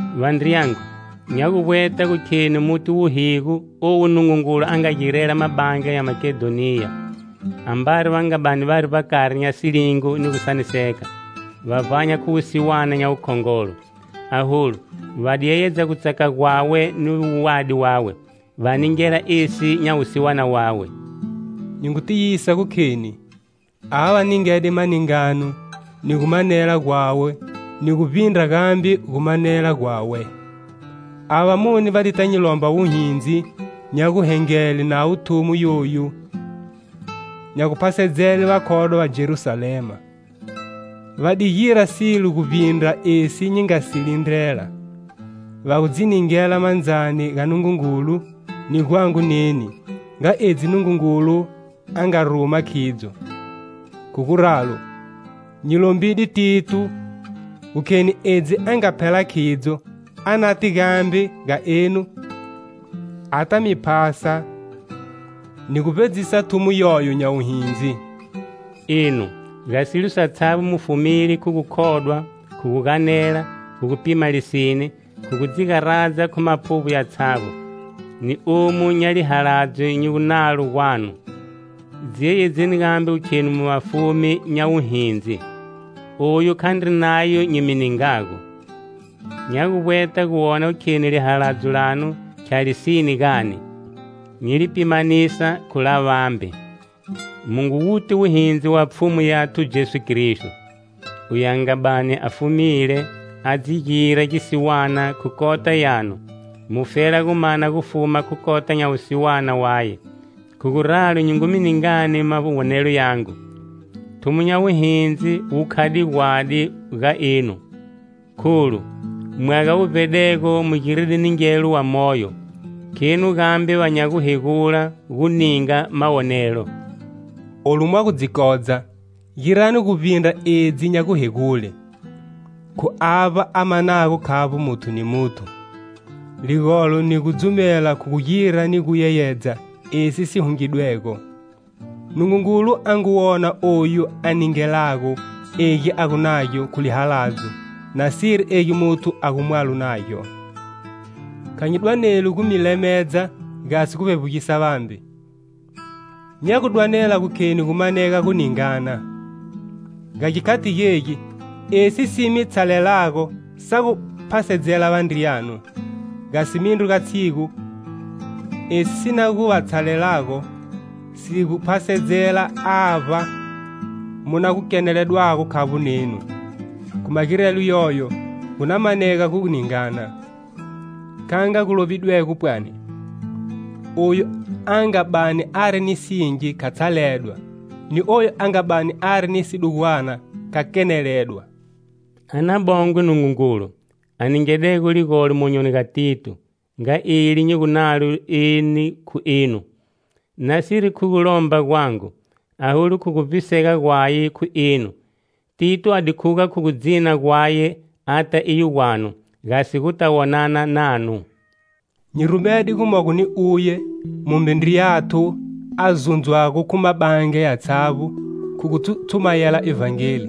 Vandriyangu, nya gu vbweta gu kheni muti wuhigo owu Nungungulu a nga girela Mabandla ya Makedhoniya. Ambari va nga bani vari vbakari nya silingo ni gusaniseka, va vbanya khu wusiwana nya wukhongolo. Aholu, va di yeyedza gutsaka gwawe ni wuwadi wawe, va ningela esi nya wusiwana wawe. Nyi ngu tiyisa gu kheni, ava va ningede maningano ni gu manela gwawe ni gu vbindra gambe gumanela gwawe. Avo vamune, va dita nyi lomba wuhindzi nya guhengele navo thumo yoyu nya guphasedzele vakhodwa va Jerusalema. Va di gira silo gu vbindra esi nyi nga si lindrela. Va gu dzi ningela mandzani ga Nungungulu, ni gwangu neni, nga edzi Nungungulu a nga ruma khidzo. Khu guralo, nyi lombide Tito, gu kheni edzi a nga phela khidzo, a nate gambe ga enu ata mi phasa ni gu vbedzisa thumo yoyo nya wuhindzi. Enu, ga silo satshavbo mu fumile khu gukhodwa, khu guganela, khu gu pima lisine, khu gu dzi garadzani khu maphuvbo yatshavbo ni, omu nya lihaladzo nyi gunalo gwanu. Dzi yeyedzeni gambe gu khenu mu vafumi nya wuhindzi. Oyu khandri nayo nyi mi ningago. Nya gu vbweta gu wona gu kheni lihaladzo lanu khya lisine gani, nyi li pimanisa khu la vambe. Mu ngu wuti wuhindzi wa Pfhumu Yathu Jesu Kristo: Uye a nga bani a fumile, a di dzi gira gisiwana khu kota yanu, mufela gu mana gufuma khu kota nya wusiwana waye. Khu guralo nyi ngu mi ningani mawonelo yangu: Thumo nya wuhindzi wu khade gwadi ga enu, kholu, mwaga wu vbedego mu giride ningelo wamoyo; khenu gambe va nya guhegula gu ninga mawonelo. Olu mwa gu dzi kodza, girani guvbindra edzi nya guhegule, khu avba a manago khavbo muthu ni muthu. Ligolo ni gudzumela khu gu gira ni gu yeyedza esi si hungidwego. Nungungulu a ngu wona oyu a ningelago egi a gu nagyo khu lihaladzo nasiri egi muthu a gumwalo nagyo. Kha nyi dwaneli gu mi lemedza gasi gu vbevbugisela vambe, nya gu dwanela gu kheni gu manege gu ningana. Ga gikhati gegi, esi si mi tshalelago sa gu phasedzela vandriyanu, gasi mindru ga tshigu, esi si na gu va tshalelago si gu phasedzela avba mu na gu keneledwago khavbo nenu. Khu magirelo yoyo gu na manega gu ningana. Kha nga gu lovidwego pwani: "Oyu a nga bani ari ni singi kha tshaledwa, ni oyu a nga bani ari ni sidugwana kha keneledwa". A na bongwe Nungungulu, a ningidego ligolo monyoni ga Tito, nga eli nyi gu nalo neni khu enu. Nasiri khu gulomba gwangu, aholu khu gu vbisega gwaye khu enu, Tito a di khuga khu gu dzina gwaye ata iyo gwanu, gasi guta wonana nanu. Nyi rumede gumogo ni uye, mumbe ndriyathu a zundzwago khu mabandla yatshavbo khu gu tshumayela Ivhangeli,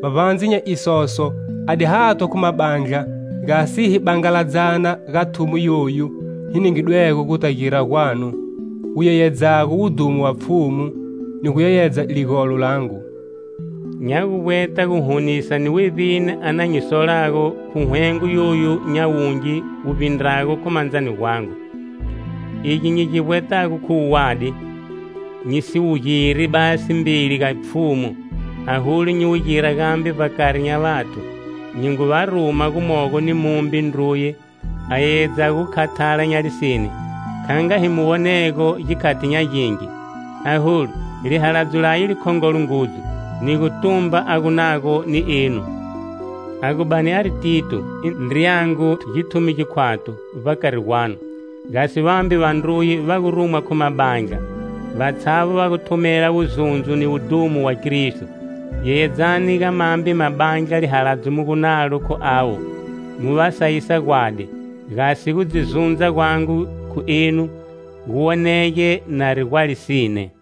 vbavbandze nya isoso a di hathwa khu mabandla, gasi hi bangaladzana ga thumo yoyu hi ningidwego guta gira gwanu, wu yeyedzago wudhumo wa Pfhumu, ni gu yeyedza ligolo langu. Nya guvbweta guhunisa ni wevbini a na nyi solago khu hwengo yoyu nya wungi wu vbindrago khu mandzani gwangu. Egi nyi gi vbwetago khu wuwadi, nyi si wu giri basi mbeli ga Pfhumu, aholu, nyi wu gira gambe vbakari nya vathu. Nyi ngu va ruma gumogo ni mumbe ndruye, a yeyedzago gu khathala nya lisine, kha nga hi mu wonego gikhati nya gingi. Aholu, lihaladzo laye likhongolo ngudzu, ni gutumba a gu nago ni enu. A gu bani ari Tito, i ndriyangu, githumi gikwathu, vbakari gwanu, gasi vambe vandruye va gu rumwa khu mabandla, vatshavbo va gu thumela wuzundzo ni wudhumo wa Kristo. Yeyedzani ga mambe mabandla lihaladzo mu gu nalo khu avo, mu va sayisa gwadi. Gasi gu dzi zundza gwangu khu enu, gu wonege nari gwa lisine.